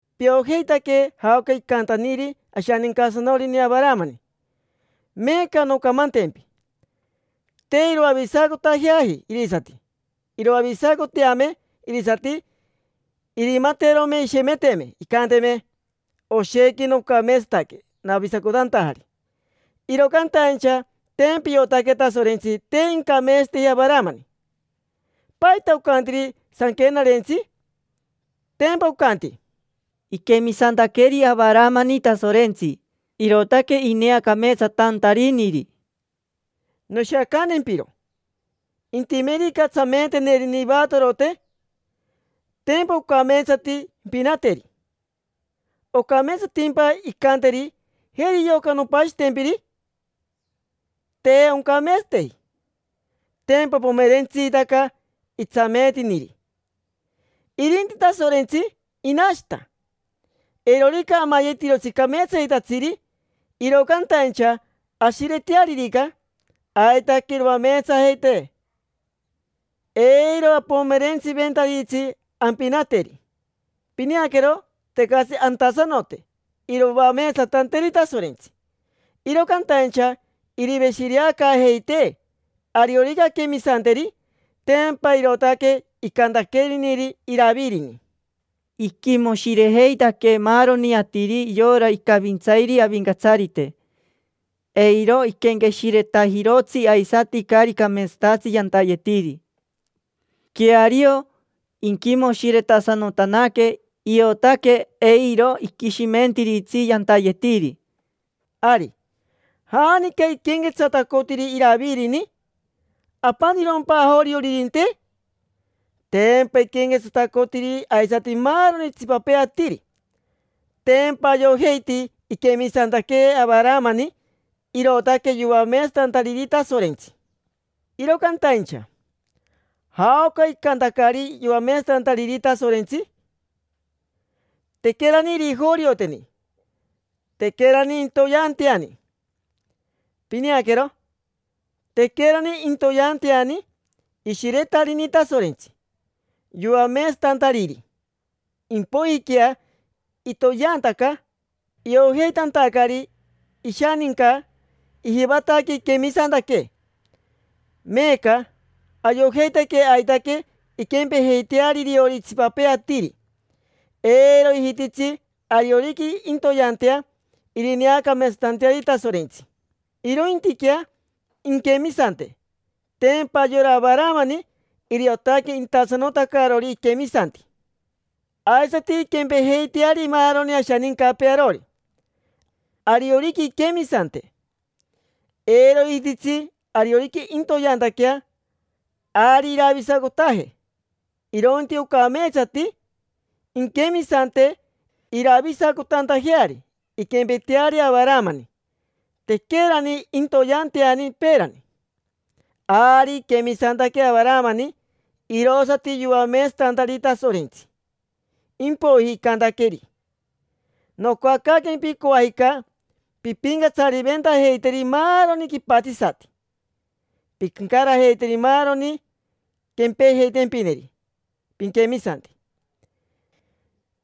Piojeitaque jaoca icantaniri ashanincasanorini Avaramani. Meeca noncamantempi: te iroavisacotajeaji irisati. Iroavisacoteame irisati, irimaterome irishemeteme, incanteme: “Oshequi nocameetsataque, navisacotantajari”. Iro cantaincha tempa iotaque Tasorentsi te incameetsateji Avaramani. ¿Paita ocantiri Sanquenarentsi? Tempa ocanti: “Iquemisantaqueri Avaramani Tasorentsi, irootaque ineacameetsatantariniri”. Noshiacantempiro: intimerica tsameetenerine ivatorote, tempa ocameetsati impinateri. ¿Ocameetsatimpa incanteri: “Jeri yoca, nompashitempiri”? Te oncameetsateji: tempa pomerentsitaca itsameetiniri. Irinti Tasorentsi, inashita: eirorica amayetirotsi cameetsayetatsiri, iro cantaincha ashiretearirica, aitaque iroameetsajeitee. Eiro apomerentsiventaritsi ampinateri. Pineaquero, tecatsi antasanote iroameetsatanteeri Tasorentsi, iro cantaincha iriveshireacaajeitee, ariorica anquemisanteri. Tempa irootaque icantaqueniri Iravirini: “Iquimoshirejeitaque maaroni atiri yora icavintsairi Avincatsarite. Eiro iquenqueshiretajirotsi aisati caari cameetsatatsi yantayetiri. Queario, inquimoshiretasanotanaque, iotaque eiro iquishimentiritsi yantayetiri”. Ari, ¿janica iquenquetsatacotiri Iravirini? ¿Apanirompa ajorioririnte? Tempa iquenquetsatacotiri aisati maaroni itsipapee atiri. Tempa ayojeiti iquemisantaque Avaramani, irootaque yoameetsatantariri Tasorentsi. Iro cantaincha ¿jaoca icantacari yoameetsatantariri Tasorentsi? Tequerani irijorioteni, tequerani intoyeanteani. Pineaquero, tequerani intoyeanteani ishiretarini Tasorentsi, yoameetsatantariri. Impoijiquea itoyeantaca, iojeitantacari ishaninca ijivataque iquemisantaque. Meeca ayojeitaque aitaque inquempejeiteari iriori itsipapee atiri: eiro ijititsi ariorica intoyeantea irineacameetsatanteariri Tasorentsi, irointiquea inquemisante. Tempa yora Avaramani iriotaque intasanotacarori iquemisanti. Aisati inquempejeiteari maaroni ashanicapee arori, ariorica inquemisante. Eiro ijititsi ariorica intoyeantaquea, ari iravisacotaje, irointi ocameetsati inquemisante iravisacotantajeari. Inquempeteari Avaramani, tequerani intoyeanteani peerani. Ari iquemisantaque Avaramani, irosati yoameetsatantariri Tasorentsi, impoiji icantaqueri: “Nocoacaaquempi coajica pimpincatsaventajeiteri maaroni quipatsisati. Pincarajeiteri maaroni quempejeitempineri piquemisanti,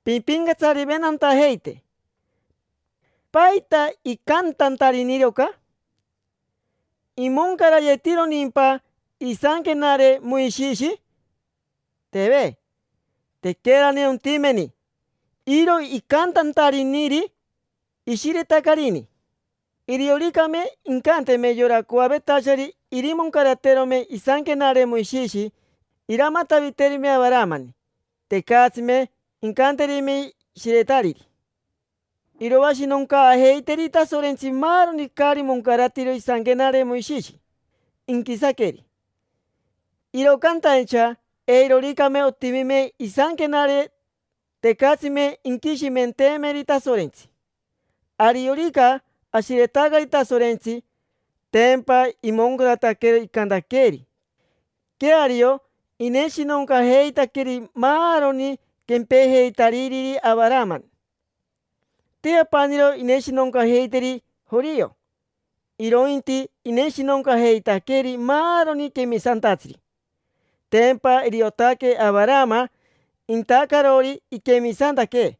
pimpincatsariventantajeite”. ¿Paita icantantariniri oca? ¿Imoncarayetironimpa isanquenare Moishishi? Teve, tequerani ontimeni. Iro icantantariniri, ishiretacarini. Irioricame incanteme yora coavetachari irimoncaraterome isanquenare Moishishi, iramataviterime Avaramani. Tecatsime incanterime shiretariri. Iroashinoncaajeiteri Tasorentsi maaroni caari moncaratiro isanquenare Moishishi, inquisaqueri. Iro cantaincha eiroricame otimime isanquenare, tecatsime inquishimenteemeri Tasorentsi. Ariorica ashiretacari Tasorentsi, tempa imoncarataquero icantaqueeri. Queario, ineshinoncajeitaqueri maaroni quempejeitariri Avarama. Te apaniro irineshinoncajeiteri jorio, irointi ineshinoncajeitaqueri maaroni quemisantatsiri. Tempa iriotaque Avarama intacarori iquemisantaque;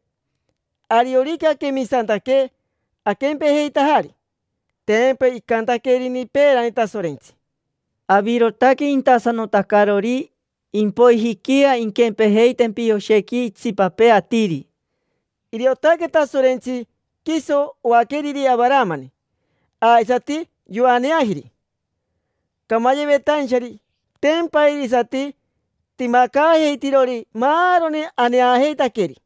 ariorica aquemisantaque, aquempejeitajari. Tempa icantaquerini peerani Tasorentsi: “Avirotaque intasanotacarori, impoijiquea inquempejeitempi oshequi itsipapee atiri”. Iriotaque Tasorentsi quiso oaqueriri Avaramani. Aisati yoaneajiri camayevetainchari, tempa irisati timacaajeitirori maaroni aneajeitaqueri.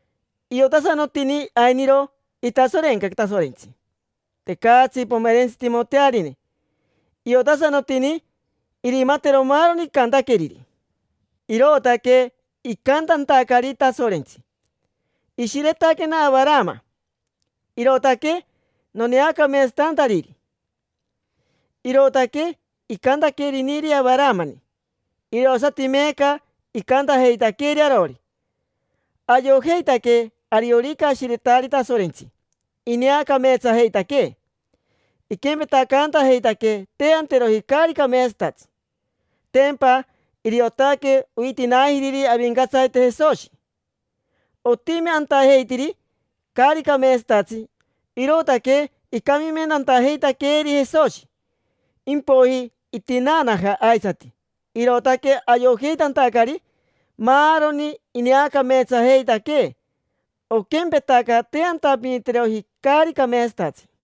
Iotasanotini ainiro itasorenca Tasorentsi, tecatsi pomerentsitimotearine; iotasanotini irimatero maaroni icantaqueriri. Irootaque icantantacari Tasorentsi: “Ishiretaquena Avarama, irootaque noneacameetsatantariri”. Irootaque icantaqueriniri Avaramani, irosati meeca icantajeitaqueeri arori; ayojeitaque ariorica ashiretari Tasorentsi, ineacameetsajeitaquee, iquempetacaantajeitaquee te anteroji caari cameetsatatsi. Tempa iriotaque oitinaajiriri Avincatsarite Jesoshi. Otimi antajeitiri caari cameetsatatsi, irootaque icamimentantajeitaqueeri Jesoshi. Impoiji itinaanaja aisati, irootaque ayojeitantacari maaroni ineacameetsajeitaquee, oquempetaca te antapiniteroji caari cameetsatatsi.